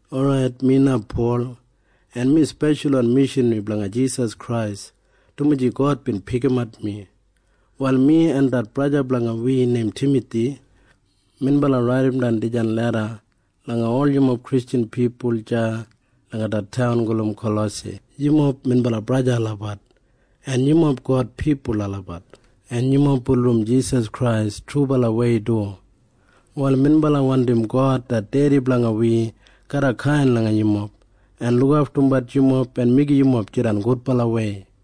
Orait, mi na Pol, en mi speshalwan mishanri blanga Jisas Krais, dumaji God bin pikimat mi. Wal mi en det braja blanga wi neim Timathi, minbala raidimdan dijan leda langa ol yumob Kristjan pipul deya langa det taun gulum Kalosai. Yumob minbala braja en sista olabat, en yumob God pipul olabat, en yumob bulurrum Jisas Krais trubalawei du. Wal minbala wandim God det Dedi blanga wi garra kain langa yumob en lukaftumbat yumob en meigim yumob jidan gudbalawei.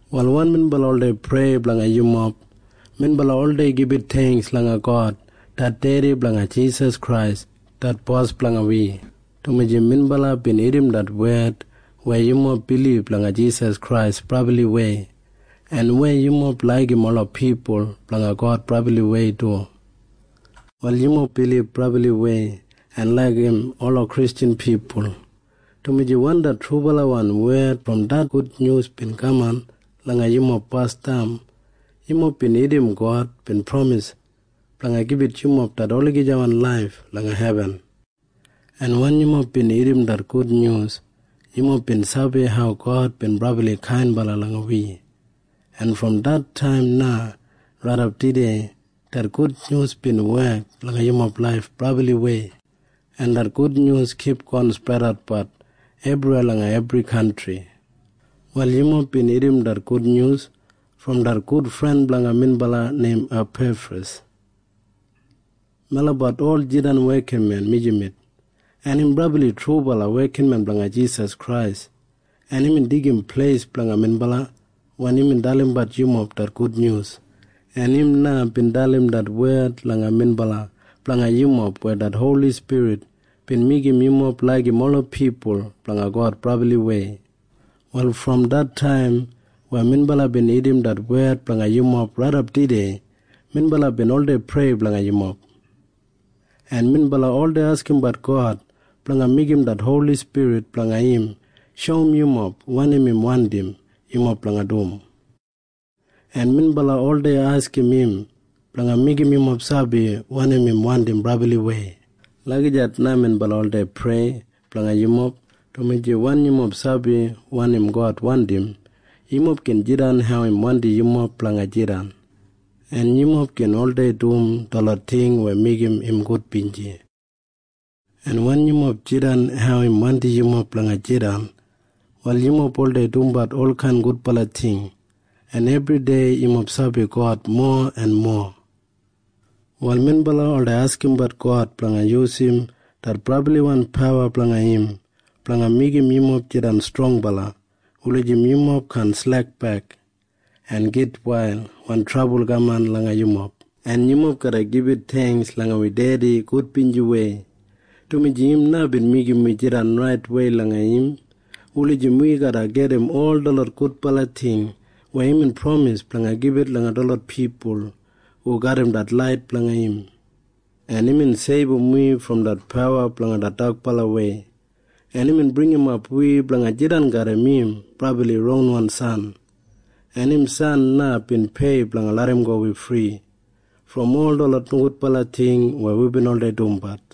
Wal wen minbala oldei prei blanga yumob, Prayer minbala oldei gibit theingks langa God det Dedi blanga Jisas Krais det Bos blanga wi, dumaji minbala bin irrim det wed weya yumob bilib langa Jisas Krais brabliwei en weya yumob laigim ola pipul blanga God brabliwei du. Wal yumob bilib brabliwei en laigim ola Kristjan pipul, dumaji wen det trubalawan wed brom det gudnyus bin kaman langa yumob basdam, yumob bin irrim God bin pramis blanga gibit yumob det olagijawan laif langa hebin, en wen yumob bin irrim det gudnyus, yumob bin sabi hau God bin brabli kainbala langa wi, en brom det taim na raidap tudei det gudnyus bin wek langa yumob laif brabliwei, en det gudnyus kipgon spredatbat ebriweya langa ebri kantri. Wal yumob bin irrim det gudnyus brom det gudfren blanga minbala neim Apefras. Melabat ol jidan wekinmen mijamet, en im brabli trubala wekinmen blanga Jisas Krais, en imbin deigim pleis blanga minbala wen imbin dalimbat yumob det gudnyus, en im na bin dalim det wed langa minbala blanga yumob weya det Holi Spirit bin meigim yumob laigim ola pipul blanga God brabliwei. Wal brom det taim weya minbala bin irrim det wed blanga yumob raidap tudei minbala bin oldei prei blanga yumob, en minbala oldei askimbat God blanga meigim det Holi Spirit blanga im shoum yumob wanim im wandim yumob blanga dum, en minbala oldei askim im blanga meigim yumob sabi wanim im wandim brabliwei. Lagijat na minbala oldei prei blanga yumob, dumaji wen yumob sabi wanim God wandim, yumob gin jidan hau im wandim yumob blanga jidan, en yumob gin oldei dum detlot ting weya meigim im gudbinji. En wen yumob jidan hau im wandim yumob blanga jidan, wal yumob oldei dumbat olkain gudbala ting, en ebridei yumob sabi God mowa en mowa. Wal minbala oldei askimbat God blanga yusum det brabliwan pawa blanga im blanga meigim yumob jidan strongbala wulijim yumob kaan slekbek en gitwail wen trabul kaman langa yumob. En yumob garra gibit theingks langa wi Dedi gudbinjiwei, dumaji im na bin meigim wi jidan raitwei langa im wulijim wi garra gedim ol detlot gudbala ting weya imbin pramis blanga gibit langa detlot pipul hu garram det lait blanga im, en imbin seibum wi brom det pawa blanga det dakbalawei, en imbin bringimap wi blanga jidan garram im brabli ronwan San, en im san na bin pei blanga larramgo wi fri brom ol detlot nogudbala ting weya wibin oldei dumbat.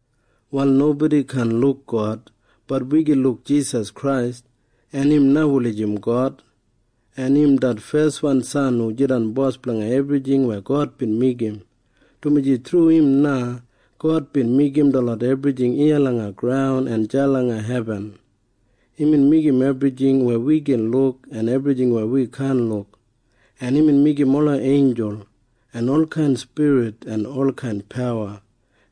Wal nobodi kaan luk God. Bat wi gin luk Jisas Krais. En im na wulijim God. En im det feswan San hu jidan Bos blanga ebrijing weya God bin meigim, dumaji thru im na God bin meigim detlot ebrijing iya langa graun en deya langa hebin. Imbin meigim ebrijing weya wi gin luk en ebrijing weya wi kaan luk, en imbin meigim ola einjul en olkain spirit en olkain pawa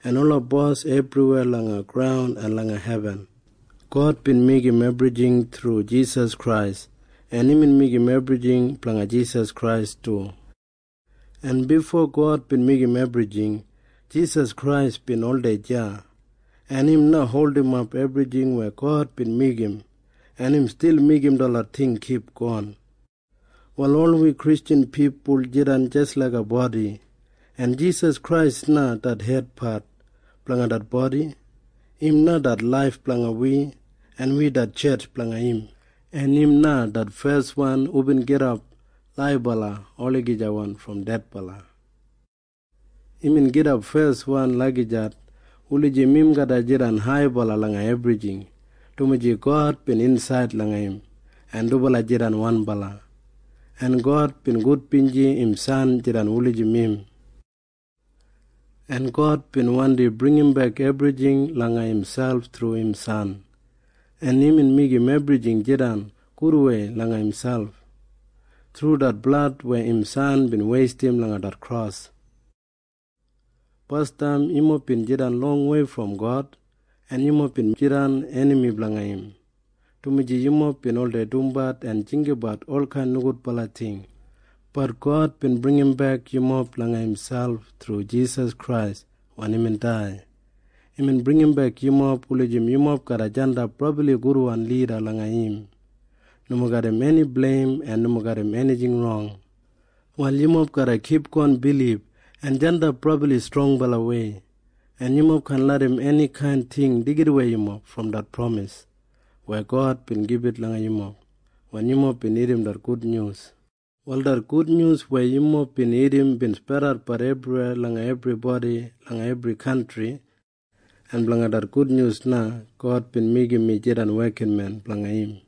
en ola bos ebriweya langa graun en langa hebin. God bin meigim ebrijing thru Jisas Krais, en imbin meigim ebrijing blanga Jisas Krais du. En bifo God bin meigim ebrijing, Jisas Krais bin oldei deya, en im na holdimap ebrijing weya God bin meigim, en im stil meigim detlot ting kipgon. Wal ol wi Kristjan pipul jidan jis laiga bodi, en Jisas Krais na det hedpat blanga det bodi. Im na det laif blanga wi, en wi det tjetj blanga im. En im na det feswan hubin gidap laibala olagijawan brom dedbala. Imbin gidap feswan lagijat wulijim im garra jidan haibala langa ebrijing, dumaji God bin insaid langa im, en dubala jidan wanbala, en God bin gudbinji im San jidan wulijim im. En God bin wandi bringimbek ebrijing langa imselp thru im San, en imbin meigim ebrijing jidan gudwei langa imselp thru det blad weya im San bin weistim langa det kros. Basdam yumob bin jidan longwei brom God, en yumob bin jidan enami blanga im, dumaji yumob bin oldei dumbat en jinggabat olkain nogudbala ting. Bat God bin bringimbek yumob langa imselp thru Jisas Krais wen imbin dai. Imbin bringimbek yumob wulijim yumob garra jandap brabli gudwan lida langa im, nomo garram eni bleim en nomo garram enijing rong. Wal yumob garra kipgon bilib en jandap brabli strongbalawei, en yumob kaan larram enikain ting deigidawei yumob brom det pramis weya God bin gibit langa yumob wen yumob bin irrim det gudnyus. Wal det gudnyus weya yumob bin irrim bin spredatbat ebriweya langa ebribodi langa ebri kantri, en blanga det gudnyus na God bin meigim mi jidan wekinmen blanga im.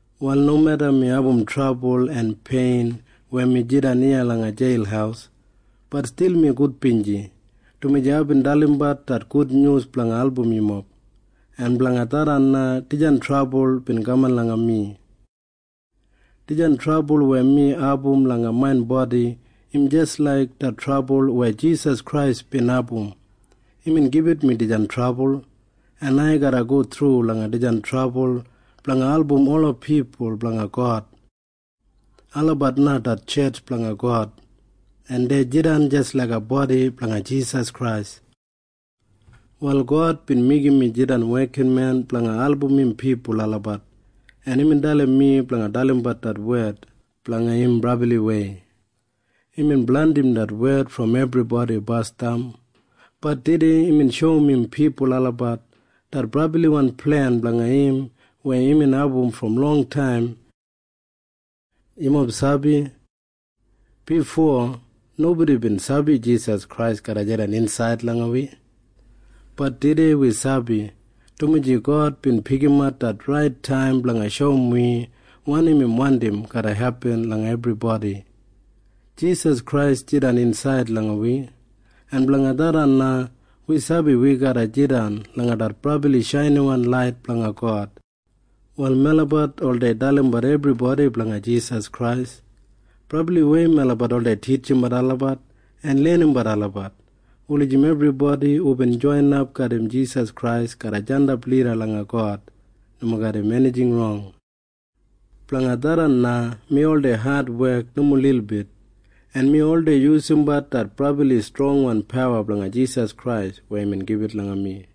Wal nomeda mi abum trabul en pein weya mi jidan iya langa jeil, bat stil mi gudbinji, dumaji aibin dalimbat det gudnyus blanga album yumob, en blanga tharran na dijan trabul bin kaman langa mi. Dijan trabul weya mi abum langa main bodi im jis laik det trabul weya Jisas Krais bin abum. Imbin gibit mi dijan trabul, en ai garra go thru langa dijan trabul blanga album ola pipul blanga God. Olabat na det tjetj blanga God, en dei jidan jis laiga bodi blanga Jisas Krais. Wal God bin meigim mi jidan wekinmen blanga album im pipul olabat, en imbin dalim mi blanga dalimbat det wed blanga im brabliwei. Imbin blandim det wed brom ebribodi basdam. Bat tudei imbin shoum im pipul olabat det brabliwan plen blanga im weya imbin abum brom longtaim. Yumob sabi? Bifo nobodi bin sabi Jisas Krais garra jidan insaid langa wi. Bat tudei wi sabi, dumaji God bin pikimat det rait taim blanga shoum wi wanim im wandim garra hepin langa ebribodi. Jisas Krais jidan insaid langa wi, en blanga tharran na wi sabi wi garra jidan langa det brabli shainiwan lait blanga God. Wal melabat oldei dalimbat ebribodi blanga Jisas Krais. Brabliwei melabat oldei titjimbat olabat en lenimbat olabat wulijim ebribodi hubin joinap garram Jisas Krais garra jandap lida langa God nomo garram enijing rong. Blanga tharran na mi oldei adwek nomo lilbit, en mi oldei yusumbat det brabli strongwan pawa blanga Jisas Krais weya imbin gibit langa mi.